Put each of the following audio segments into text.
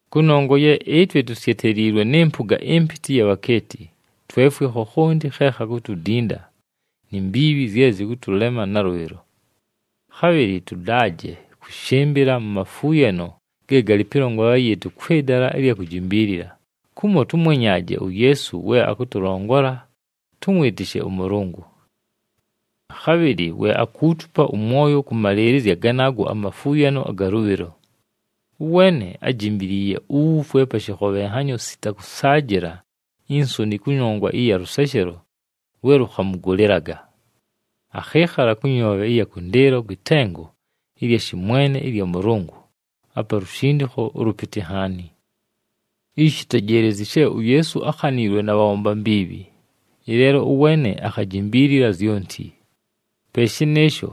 Kʉnongwa ye ɨtwe tusyeteliilwe nɨ mpʉga ɨmpɨtɨ ɨya bhakeeti, twefwe khokhonti khe khakutudinda, ni mbiibhi zye zɨkʉtʉlema nalʉbhɨlo. Khabhɨlɨ tʉdaaje kʉshɨmbɨla mu mafuuyano ge galɨ pɨlongolela yɨɨtʉ kwɨ dala ɨlya kujimbiilila, kumo tʉmwenyaaje uYeesu we akʉtʉlongola tʉmwɨtɨshe ʉMʉlʉngʉ. Khabhɨlɨ we akuutupa ʉmwoyo kʉmalɨɨlɨzya ganaago amafuuyano aga lʉbhɨlo. Ʉweene ájimbiliiye uwufwe pa shɨkhobhenhanyo sita kʉsaajɨla insoni kʉnongwa ɨya lʉseshelo lwe lʉkhamʉgʉlɨlaga. Akhɨɨkhala kʉ nyoobhe ɨya kʉndɨɨlo kwɨ tengo ɨlya shɨmwene ɨlya Mʉlʉngʉ, apa lushindikho ʉlʉpɨtɨ nhaani. Ishi tejeelezyi she uYeesu ákhaniilwe na bhabhomba mbiibhi, ɨleelo ʉweene akhajimbiilila zyonti. Pe shɨnɨɨsho,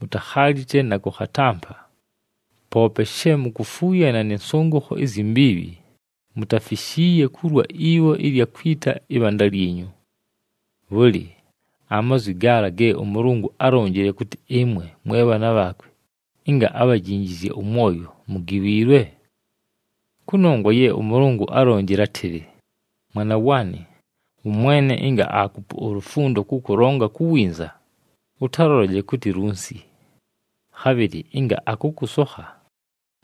mutakhalite na kʉkhatampa. Poope she mukufuuyana nɨ nsʉngʉkho izyi mbiibhi, mutafishiiye kulwa ibho ɨlya kwita ɨbhanda lyinyu. Bhʉlɨ, amazwi gaala ge ʉMʉlʉngʉ álonjile kʉtɨ ɨmwe mwe bhaana bhaakwe, ɨnga abhajinjizye ʉmwoyo, mugiwiilwe? Kʉnongwa ye ʉMʉlʉngʉ álonjile átɨlɨ, “Mwana waanɨ, ʉMwene ɨnga aakupa ulufundo kʉkʉlongola ku winza, ʉtalʉlolaje kʉtɨ lunsi. Khabhɨlɨ ɨnga akʉkʉsokha,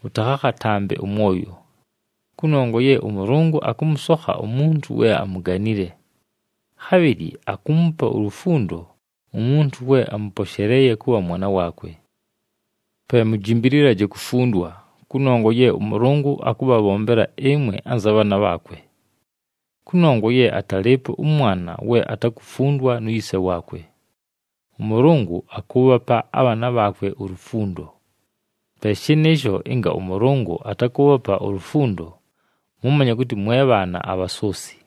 ʉtakhakhatampe ʉmwoyo. Kʉnongwa ye ʉMʉlʉngʉ akʉmʉsokha umuntu we amuganile. Khabhɨlɨ akuumupa ulufundo umuntu we amʉposheleeye kʉbha mwana waakwe.” Pe mujimbililaje kufundwa, kʉnongwa ye ʉMʉlʉngʉ akʉbhabhombela ɨmwe anza bhaana bhaakwe. Kʉnongwa ye atalɨɨpo ʉmwana we atakufundwa nu yise waakwe. ɄMʉlʉngʉ akʉʉbhapa abhaana bhaakwe ulufundo. Pe shɨnɨɨsho ɨnga ʉMʉlʉngʉ atakʉʉbhapa ulufundo, mʉmanye kʉtɨ mwe bhaana abhasoosi,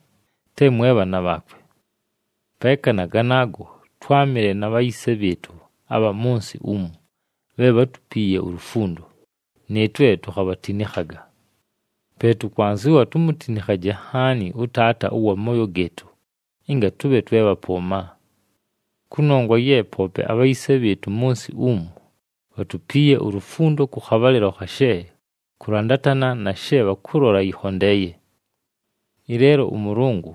te mwe bhaana bhaakwe. Peeka na ganaago, twámɨle na bhayise bhɨɨtʉ abha mʉ nsɨ umu bhe bhátupiiye ulufundo, nɨɨtwe tukhabhatinikhaga. Pe tʉkwanzɨwa tumutinikhaje nhaani ʉTaata ʉwa mooyo gɨɨtʉ, ɨnga tʉbhe twe bhapʉʉma. Kʉnongwa ye poope abhayise bhɨɨtʉ mʉ nsɨ umu bhatupiiye ulufundo kʉ khabhalɨlo khashe kʉlandatana na she bhakʉlola yɨkhondeeye. Ɨleelo ʉMʉlʉngʉ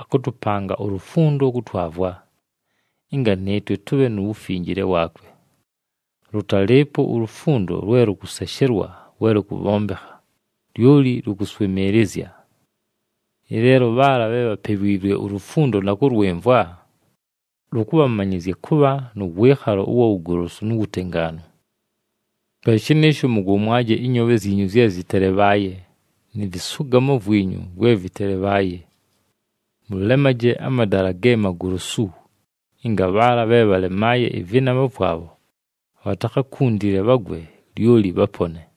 akʉtʉpanga ulufundo kʉtwavwa, ɨnga nɨɨtwe tʉbhe nu wufinjile waakwe. Lʉtalɨɨpo ulufundo lwe lʉkʉseshelwa we lʉkʉbhombekha, lyoli lʉkʉswɨmɨɨlɨzya. Ɨleelo bhaala bhe bhapewiilwe ulufundo na kʉlwɨmvwa, lʉkʉbhamanyɨzya kʉbha nʉ wɨɨkhalo ʉwa wugolosu nu wutengaanu. Pe shɨnɨɨsho mʉgomwaje ɨnyoobhe zyinyu zye zɨtelebhaaye, nɨ vɨsʉgamo vwinyu vwe vɨtelebhaaye. Mʉlemaje amadala ge magolosu, ɨnga bhaala bhe bhalemaaye ɨvɨnama vwabho bhatakhakuntile bhagwe, lyoli bhapone.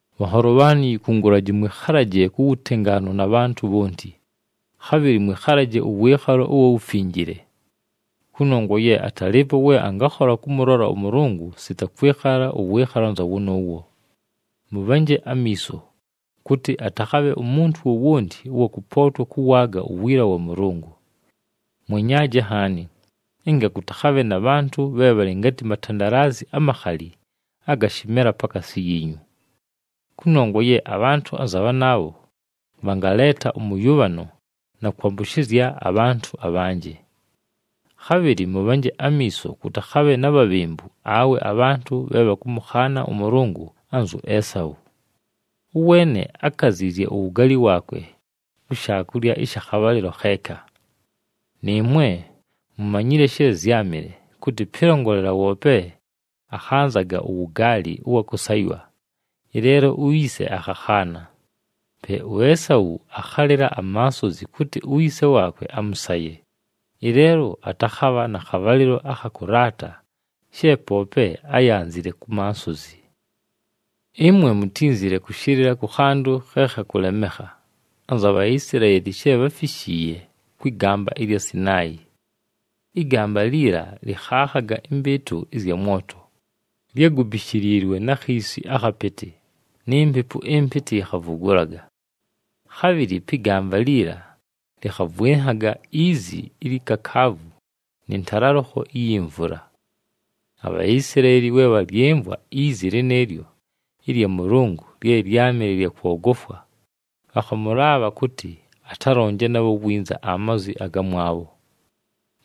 Bhanholo bhaanɨ, yikungulaji mwɨkhalaje ku wutengaanu na bhantʉ bhonti, khabhɨlɨ mwɨkhalaje ʉwɨɨkhalo ʉwa wufinjile. Kʉnongwa ye atalɨɨpo we angakhola kʉmʉlola ʉMʉlʉngʉ sita kwɨkhala ʉwɨɨkhalo anza wʉnʉʉwo. Mʉbhanje amiiso, kʉtɨ atakhabhe umuntu wowonti ʉwa kʉpootwa kʉwaaga uwiila wa Mʉlʉngʉ. Mwenyaaje nhaani ɨnga kʉtakhabhe na bhantʉ bhe bhalɨ ngatɨ matandalazi amakhali aga shɨmela pakaasi yiinyu. Kʉnongwa ye abhantʉ anza bhanaabho bhangaleeta ʉmʉyʉbhano na kwambʉshɨzya abhantʉ abhanjɨ. Khabhɨlɨ mʉbhanje amiiso kʉtakhabhe na bhabhembu awe abhantʉ bhe bhakʉmʉkhaana ʉMʉlʉngʉ anzu Esau. Ʉweene ákaziizye uwugaali waakwe ku shaakulya ɨsha khabhalɨlo kheeka. Nɨɨmwe mumanyile she zyámɨle, kʉtɨ pɨlongolela woope akhanzaga uwugaali ʉwa kʉsaywa, ɨleelo uyise akhakhaana. Pe uEsau akhalɨla amansozi kʉtɨ uyise waakwe amʉsaye, ɨleelo atakhabha na khabhalɨlo akha kʉlaata she poope áyanzile ku mansozi. Ɨmwe mutínzile kʉshɨlɨla kʉ khantʉ khe khakʉlemekha anza Bhaisilaeli she bháfishiiye kwɨ gamba ɨlya Sinaayi. Ɨgamba liila lɨkhaakhaga ɨmbɨɨtʉ ɨzya mwoto, lyágubishiliilwe na khiisi akhapɨtɨ, ni mpepu ɨmpɨtɨ yikhavugulaga. Khabhɨlɨ pɨ gamba liila lɨkhavwɨnhaga izi ilyi kakaavu nɨ ntalalʉkho iyi mvula. ABhaisilaeli we bhalyɨmvwa izi lɨnɨɨlyo ɨlya Mʉlʉngʉ lye lyámɨle lya kwogofwa, bhakhamʉlaabha kʉtɨ atalonje nabho winza amazwi agamwabho.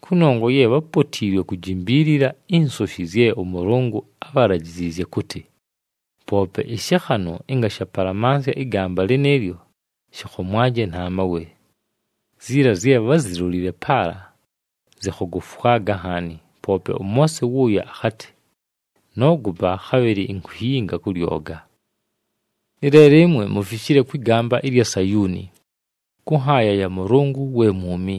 Kʉnongwa ye bhápotiilwe kujimbiilila insoshi zye ʉMʉlʉngʉ ábhalajiziizye kʉtɨ, “Poope ɨshɨkhanʉ ɨnga shapalamansya ɨgamba lɨnɨɨlyo, shɨkhomwaje na mawe.” Ziila zye bházilolile paala zɨkhogofwaga nhaani, poope ʉMoose wʉʉyo akhatɨ, “Noogopa, khabhɨlɨ inkuyinga kʉ lyoga.” Ɨleelo ɨmwe mufishile kwɨ gamba ɨlya Sayuuni, kʉ nhaaya ya Mʉlʉngʉ we mwumi.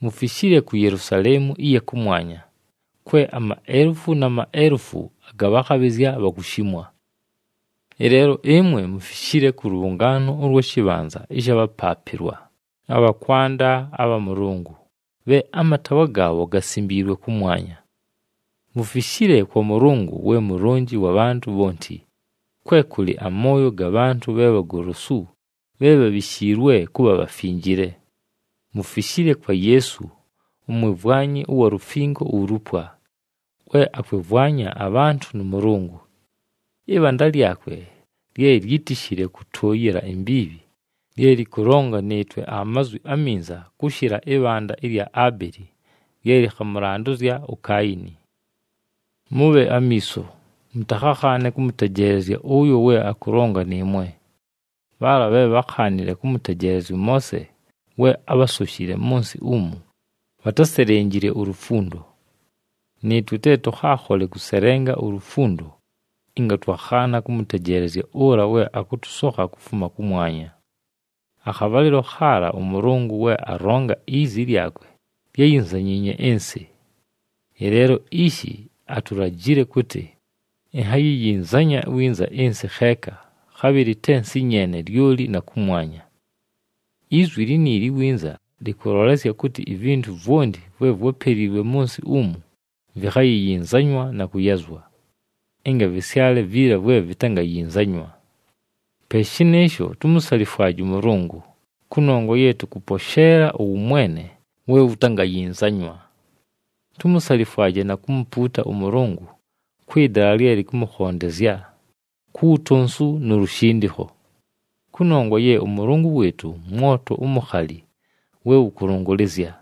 Mufishile ku Yelusaleemu ɨya kʉmwanya, kwe amaelufu na maelufu aga bhakhabhɨzya bhakushimwa. Ɨleelo ɨmwe mufishile kʉ lʉbhʉngaano ʉlwa shɨbhanza ɨsha bhapaapɨlwa abha kwanda abha Mʉlʉngʉ, bhe amataawa gaabho gasimbiilwe kʉmwanya. Mufishile kwa Mʉlʉngʉ we Mulonji wa bhantʉ bhonti, kwe kʉlɨ amooyo ga bhantʉ bhe bhagolosu bhe bhabhishiilwe kʉbha bhafinjile. Mufishile kwa Yeesu, umwimvwanyi ʉwa lufingo ulupwa, we akwɨmvwanya abhantʉ nʉ Mʉlʉngʉ. Ɨbhanda lyakwe lye lyítishile kʉtʉʉyɨla imbiibhi, lye lɨkʉlonga nɨɨtwe amazwi aminza kʉshɨla ɨbhanda ɨlya Abeli lye lɨkhamʉlandʉzya uKaayini. Mʉbhe amiiso, mʉtakhakhaane kʉmʉtejeelezya ʉyo we akʉlonga nɨɨmwe. Bhaala bhe bhákhaanile kʉmʉtejeelezya ʉMoose we ábhasoshile mʉ nsɨ umu, bhatáselenjile ulufundo. Nɨɨtwe te tʉkhaakhole kʉselenga ulufundo ɨnga twakhaana kʉmʉtejeelezya ʉla we akʉtʉsokha kufuma kʉmwanya. Akhabhalɨlo khaala, ʉMʉlʉngʉ we alonga, izi lyakwe lyáyinzanyiinye ɨnsɨ. Ɨleelo ishi atulajile kʉtɨ, “Inhayiyinzanya winza ɨnsɨ kheeka, khabhɨlɨ te nsɨ nyeene, lyoli na kʉmwanya.” Izwi liniili “winza” lɨkʉlolesya kʉtɨ ivintu vwonti vwe vwápeliilwe mʉ nsɨ umu vikhayiyinzanywa na kʉyazwa, ɨnga vɨsyale viila vwe vitangayinzanywa. Pe shɨnɨɨsho, tumusalifwaje ʉMʉlʉngʉ, kʉnongwa ye tʉkʉposheela ʉwʉmwene we wutangayinzanywa. Tumusalifwaje na kumupuuta ʉMʉlʉngʉ kwɨ dala lye lɨkʉmʉkhondezya, ku wutonsu nu lushindikho. Kʉnongwa ye ʉMʉlʉngʉ wɨɨtʉ mwoto umukhali we wʉkʉlʉngʉlɨzya!